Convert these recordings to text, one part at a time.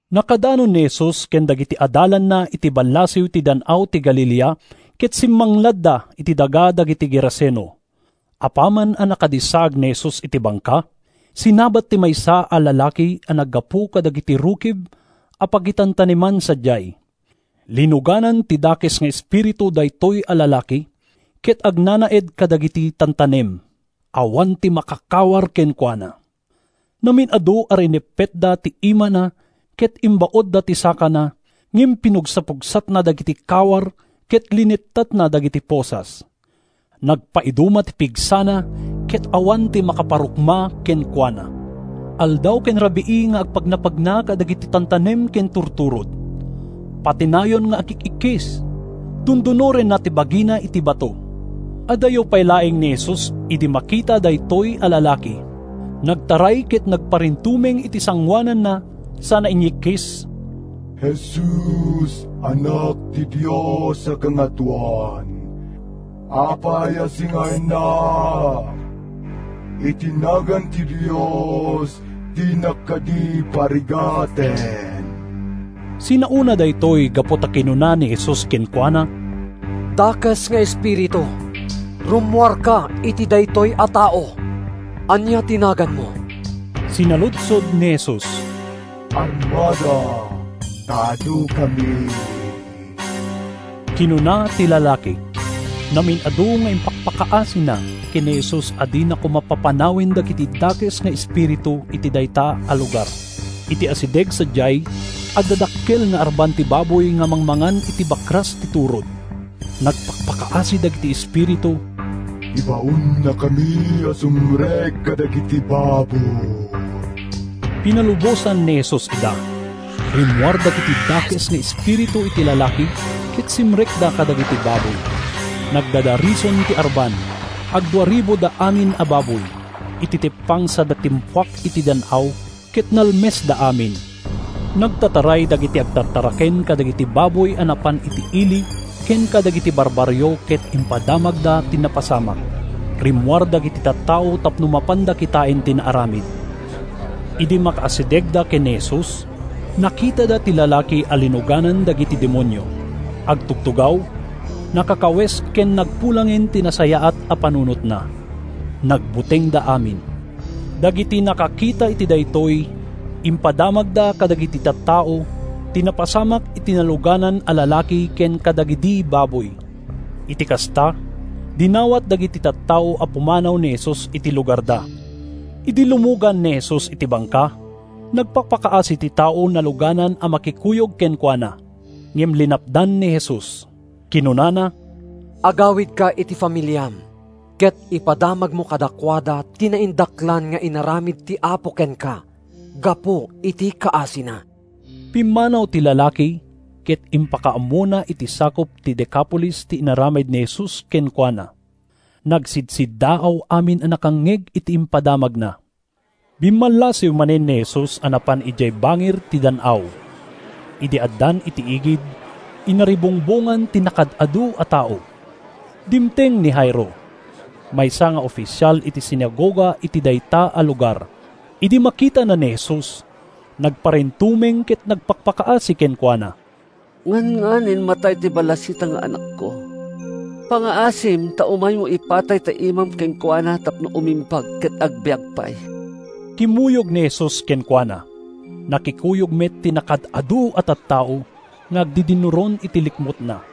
Nakadanon ni Jesus ken dagiti adalanna iti ballasiw ti Dan-aw ti Galilea ket simmangladda iti daga dagiti Geraseno. Apaman a nakadissaag ni Jesus iti bangka, sinabat ti maysa a lalaki a naggapu kadagiti rukib a pagitantaneman sadiay. Linuganan ti dakes nga espiritu daytoy a lalaki ket agnanaed kadagiti tantanem. Awan ti makakawar kenkuana. Namin-adu a rineppetda ti imana ken imbaudda ti sakana, ngem pinugsapugsatna dagiti kawar ket linettatna dagiti posas. Nagpaiduma ti pigsana ket awan ti makaparukma kenkuana. Aldaw ken rabii nga agpagnapagna kadagiti tantanem ken turturod. Patinayon nga agik-ikkis. Dundunorenna ti bagina iti bato. Adayo pay laeng ni Jesus idi makita daytoy a lalaki. Nagtaray ket nagparintumeng iti sangoananna sana inyikkis, “Jesus, Anak ti Dios a Kangatoan. Apay a singaennak? Iti nagan ti Dios, dinak kadi parigaten.” ( Sinaona daytoy gapu ta kinuna ni Jesus kenkuana, “Dakes nga espiritu, rummuarka iti daytoy a tao!”) “Ania ti naganmo?” sinaludsod ni Jesus. “‘Armada,’ ta adukami,” kinuna ti lalaki. Namin-adu nga impakpakaasina ken ni Jesus a dina koma papanawen dagiti dakes nga espiritu iti dayta a lugar. Iti asideg sadiay, adda dakkel nga arban ti baboy nga mangmangan iti bakras ti turod. Nagpakpakaasi dagiti espiritu, “Ibaonnakami a sumrek kadagiti baboy.” Pinalubosan ni Jesus ida. Rimmuar dagiti dakes nga espiritu iti lalaki ket simrekda kadagiti baboy. Nagdadarison ti arban—agduaribuda amin a baboy—iti teppang sada timpuak iti dan-aw, ket nalmesda amin. Nagtataray dagiti agtartaraken kadagiti baboy a napan iti ili ken kadagiti barbarrio ket impadamagda ti napasamak. Rimmuar dagiti tattao tapno mapanda kitaen ti naaramid. Idi makaasidegda ken ni Jesus, nakitada ti lalaki a linuganan dagiti demonio. Agtugtugaw, nakakawes ken nagpulangen ti nasayaat a panunotna. Nagbutengda amin. Dagiti nakakita iti daytoy impadamagda kadagiti tattao ti napasamak iti naluganan a lalaki ken kadagidi baboy. Iti kasta, dinawat dagiti tattao a pumanaw ni Jesus iti lugarda. Idi lumugan ni Jesus iti bangka, nagpakpakaasi ti tao naluganan a makikuyog kenkuana. Ngem linapdan ni Jesus. Kinunana, “Agawidka iti familiam ket ipadamagmo kadakuada ti naindaklan nga inaramid ti Apo kenka gapu iti kaasina.” Pimmanaw ti lalaki, ket impakaammona iti sakup ti Decapolis ti inaramid ni Jesus kenkuana. Nagsidsiddaaw amin a nakangngeg iti impadamagna. Bimmallasiw manen ni Jesus a napan idiay bangir ti dan-aw. Idi addan iti igid, inaribungbongan ti nakaad-adu a tao. Dimteng ni Jairo, maysa nga ofisial iti sinagoga iti dayta a lugar. Idi makitana ni Jesus, nagparintumeng ket nagpakpakaasi kenkuana, “Ngannganin matay ti balasitang nga anakko. Pangngaasim ta umaymo ipatay ta imam kenkuana tapno umimbag ket agbiag pay!” Kimmuyog ni Jesus kenkuana. Nakikuyog met ti nakaad-adu a tattao nga agdidinnuron iti likmutna.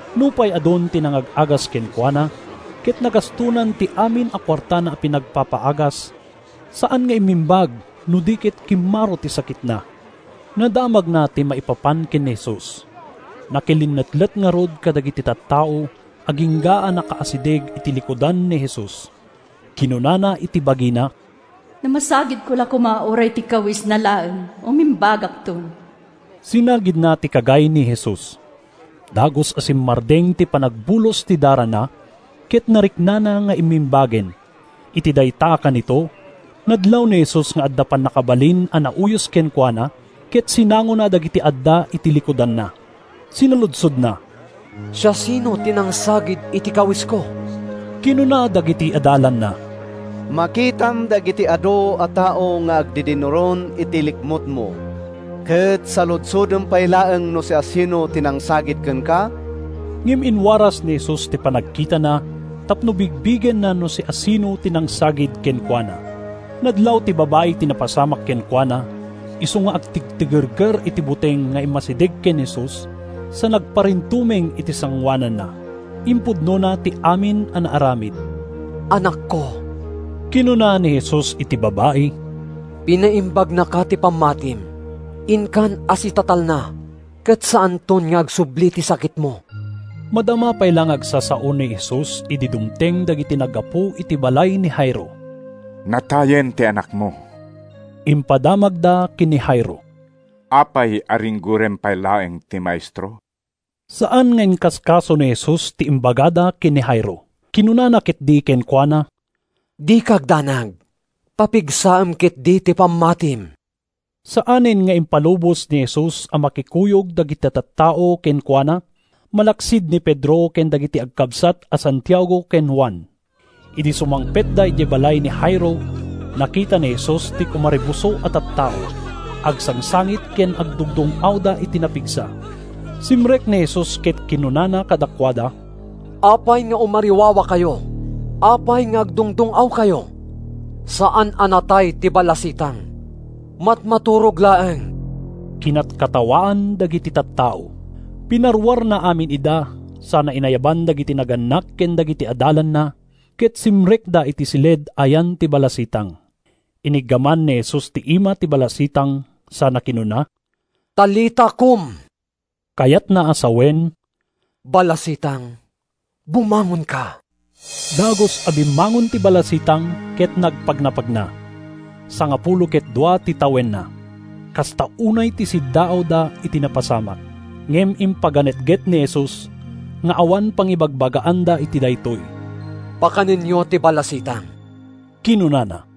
Nupay adun ti nangag-agas kenkuana, ket nagastonan ti amin a kuartana a pinagpapaagas, saan nga immimbag, no di ket kimmaro ti sakitna. Nadamagna ti maipapan ken ni Jesus. Nakilinnetlet ngarud kadagiti tattao agingga a nakaasideg iti likudan ni Jesus. Kinunana iti bagina, “No masagidko la koma uray ti kawesna laeng, umimbagakton!” Sinagidna ti kagay ni Jesus. Dagus a simmardeng ti panagbulos ti darana ket nariknana nga immimbagen. Iti dayta a kanito, nadlaw ni Jesus nga adda pannakabalin a nauyos kenkuana ket sinangona dagiti adda iti likudanna. Sinaludsodna, “Siasino ti nangsagid iti kawesko?” Kinuna dagiti adalanna, “Makitam dagiti adu a tao nga agdidinnuron iti likmutmo, ket saludsodem pay laeng no siasino ti nangsagid kenka?” Ngem inwaras ni Jesus ti panagkitana tapno bigbigenna no siasino ti nangsagid kenkuana. Nadlaw ti babai ti napasamak kenkuana, isu nga agtigtigerger iti buteng nga immasideg ken Jesus sa nagparintumeng iti sangoananna. Impudnona ti amin a naaramid. “Anakko,” kinuna ni Jesus iti babai, “pinaimbagnaka ti pammatim. Inkan a sitatalna ket saanton nga agsubli ti sakitmo!” Madama pay la nga agsasao ni Jesus idi dumteng dagiti naggapu iti balay ni Jairo. “Natayen ti anakmo,” impadamagda ken ni Jairo. “Apay a ringgorem pay laeng ti Maestro?” Saan nga inkaskaso ni Jesus ti imbagada ken ni Jairo. Kinunana ketdi kenkuana, “Dika agdanag. Papigsaem ketdi ti pammatim.” Saanen nga impalubos ni Jesus a makikuyog dagiti tattao kenkuana, malaksid ni Pedro ken dagiti agkabsat a Santiago ken Juan. Idi sumangpetda idiay balay ni Jairo, nakita ni Jesus ti kumaribuso a tattao. Agsangsangit ken agdungdung-awda iti napigsa. Simrek ni Jesus ket kinunana kadakuada, “Apay nga umariwawakayo? Apay nga agdungdung-awkayo? Saan a natay ti balasitang; matmaturog laeng!” Kinatkatawaan dagiti tattao. Pinaruarna amin ida sana inayaban dagiti nagannak ken dagiti adalanna, ket simrekda iti siled a yan ti balasitang. Iniggaman ni Jesus ti ima ti balasitang sana kinuna: “Talita, kum!” (Kayatna a sawen, “Balasitang, bumangonka!”) Dagus a bimmangon ti balasitang ket nagpagnapagna. (Sangapulo ket dua ti tawenna.) Kasta unay ti siddaawda iti napasamak. Ngem impaganetget ni Jesus nga awan pangibagbagaanda iti daytoy. “Pakanenyo ti balasitang,” kinunana.